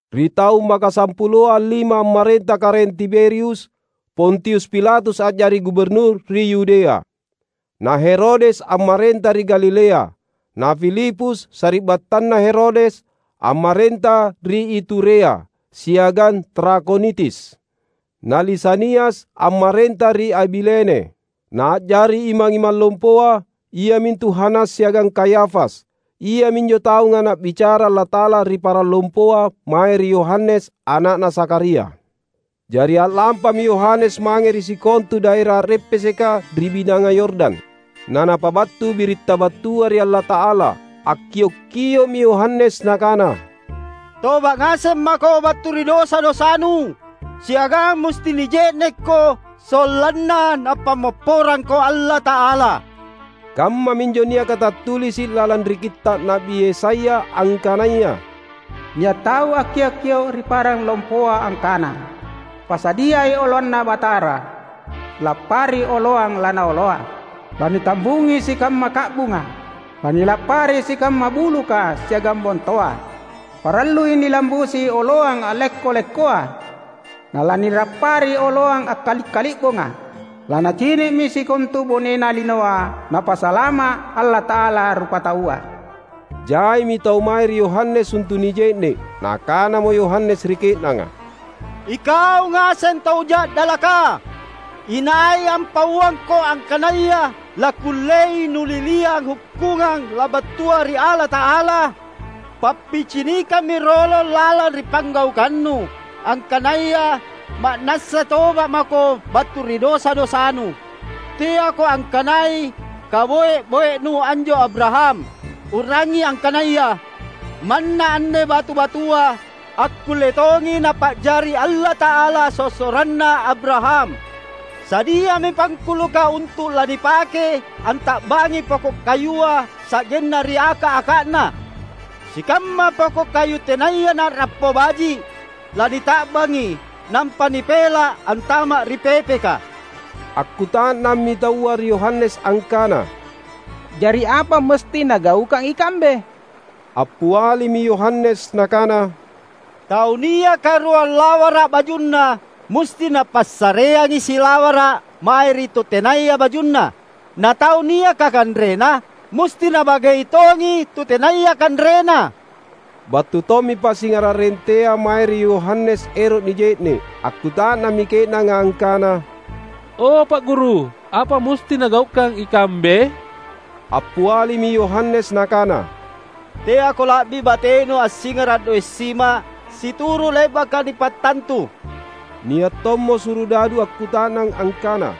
Ri taung makasampuloa allima ammarenta Karaeng Tiberius, Pontius Pilatus a’jari guburnur ri Yudea; na Herodes ammarenta ri Galilea; na Filipus, sari’battanna Herodes, ammarenta ri Iturea siagang Trakhonitis; na Lisanias ammarenta ri Abilene. Na a’jari imang-imang lompoa, iamintu Hanas siagang Kayafas Iaminjo taunga Na’bicara Allata’ala ri parang lompoa mae ri Yohanes, ana’na Zakharia. Jari a’lampami Yohanes mange ri sikontu daera a’reppeseka ri Binanga Yordan, na napabattu biritta battua ri Allata’ala. Akkiok-kio’mi Yohanes nakana, "Toba’ ngaseng mako battu ri dosa-dosanu, siagang musti nije’nekko, sollanna Napammopporangko Allata’ala." Kammaminjo niaka tattulisi’ lalang ri kitta’ Na’bi Yesaya angkanaya, "Nia’ tau akkiok-kio’ ri parang lompoa, angkana, ‘Pasadiai oloanNa Batara, lappari oloang laNaoloa. Lanitambungi sikamma ka’bunga lanilappari sikamma buluka siagang bontoa Parallui nilambusi oloang a’lekko-lekkoa, na lanilappari oloang akkali’-kali’bonga. Lanacini’mi sikontu bonena linoa Napasalama’ Allata’ala rupataua!’" Jaimi tau mae ri Yohanes untu’ nije’ne’. Nakanamo Yohanes ri ke’nanga, "Ikau ngaseng tau ja’dalaka! Inai ampauangko angkanaya lakkullei nuliliang hukkungang labattua ri Allata’ala? Pappicinikammi rolong lalang ri panggaukannu, angkanaya ma’nassa toba’ mako battu ri dosa-dosanu! Teako angkanai kaboe-boenu anjo Abraham. U’rangi angkanaya: Manna anne batu-batua akkulle tongi Napa’jari Allata’ala sossoranna Abraham! Sadiami pangkuluka untu’ lanipake anta’bangi poko’ kayua sa’genna ri aka’-aka’na. Sikamma poko’ kayu tenaya na’rappo baji’, lanita’bangi nampa nipela’ antama’ ri pepeka." Akkuta’nammi taua ri Yohanes angkana, "Jari apa musti nagaukang ikambe?" Appialimi Yohanes nakana, "Tau niaka ruang lawara’ bajunna, musti napassareangi silawara’ mae ri tu tenaya bajunna. Na tau niaka kanrena, musti nabagei tongi tu tenaya kanrena." Battu tommi pasingara’ rentea mae ri Yohanes ero’ nije’ne’. Akkuta’nammi ke’nanga angkana, "O, Pa’ Guru, apa musti nagaukang ikambe?" Appialimi Yohanes nakana, "Teako la’bi batenu assingara’ doe’ sima situru’ le’baka nipattantu." Nia’ tommo surudadu akkuta’nang angkana,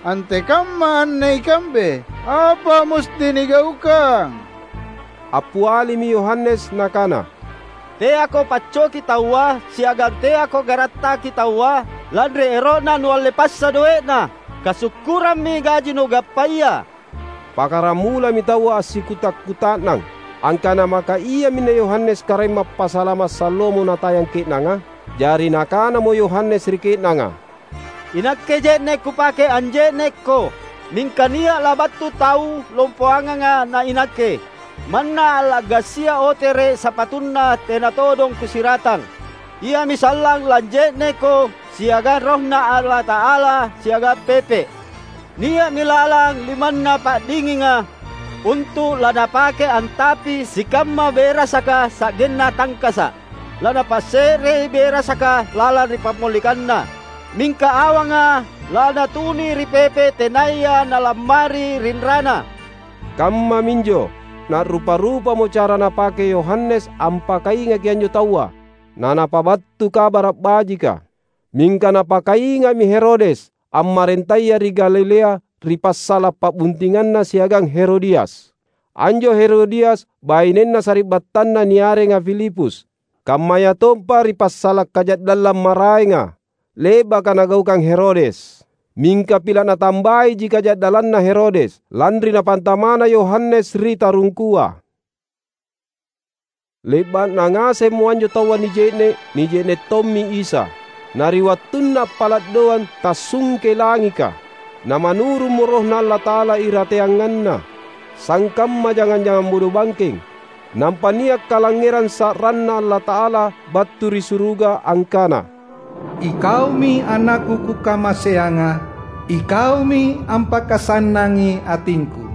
"Antekamma anne ikambe? Apa musti nigaukang?" Appialimi Yohanes nakana, "Teako paccoki taua, siagang teako garattaki taua lanri ero’na nualle passa doe’na. Kasukkurammi gaji nugappaya!" Pakkaramulami taua assikuta’-kuta’nang, angkana maka iaminne Yohanes Karaeng Mappasalama’ salloamo natayang ke’nanga. Jari nakanamo Yohanes ri ke’nanga, "Inakke je’ne’ kupake anje’nekko, mingka nia’ labattu tau lompoanganga na inakke. Manna alla’gasia otere’ sapatuNa tena todong kusiratang. Iami sallang lanje’nekko siagang RohNa Allata’ala siagang pepe’. Nia’mi lalang limanNa pa’dinginga, untu’ laNapake antapi sikamma berasaka sa’genna tangkasa’. LaNapasse’rei berasaka lalang ri pammolikanna; mingka awanga laNatunui ri pepe’ tenaya nalammari rinrana!" Kammaminjo, na’rupa-rupamo cara napake Yohanes ampakaingaki anjo taua, na napabattu Kabara’ Bajika. Mingka napakainga’mi Herodes, ammarentaya ri Galilea ri passala’ pa’buntinganna siagang Herodias. Anjo Herodias bainenna sari’battanna niarenga Filipus. Kammayatompa ri passala’ kaja’dallang maraenga, le’baka nagaukang Herodes. Mingka pila’ natambaiji kaja’dallanna Herodes, lanri napantama’na Yohanes ri tarungkua. Le’ba’na ngasemmo anjo taua nije’ne’, nije’ne’ tommi Isa. Na ri wattunna appala’ doang tassungkei langika, na manurummo RohNa Allata’ala irateanganNa, sangkamma jangang-jangang bodobangkeng. Nampa nia’ kalangngerang sa’ranNa Allata’ala battu ri suruga angkana, "IKaumi AnakKu Kukamaseanga. IKaumi ampakasannangi atingKu."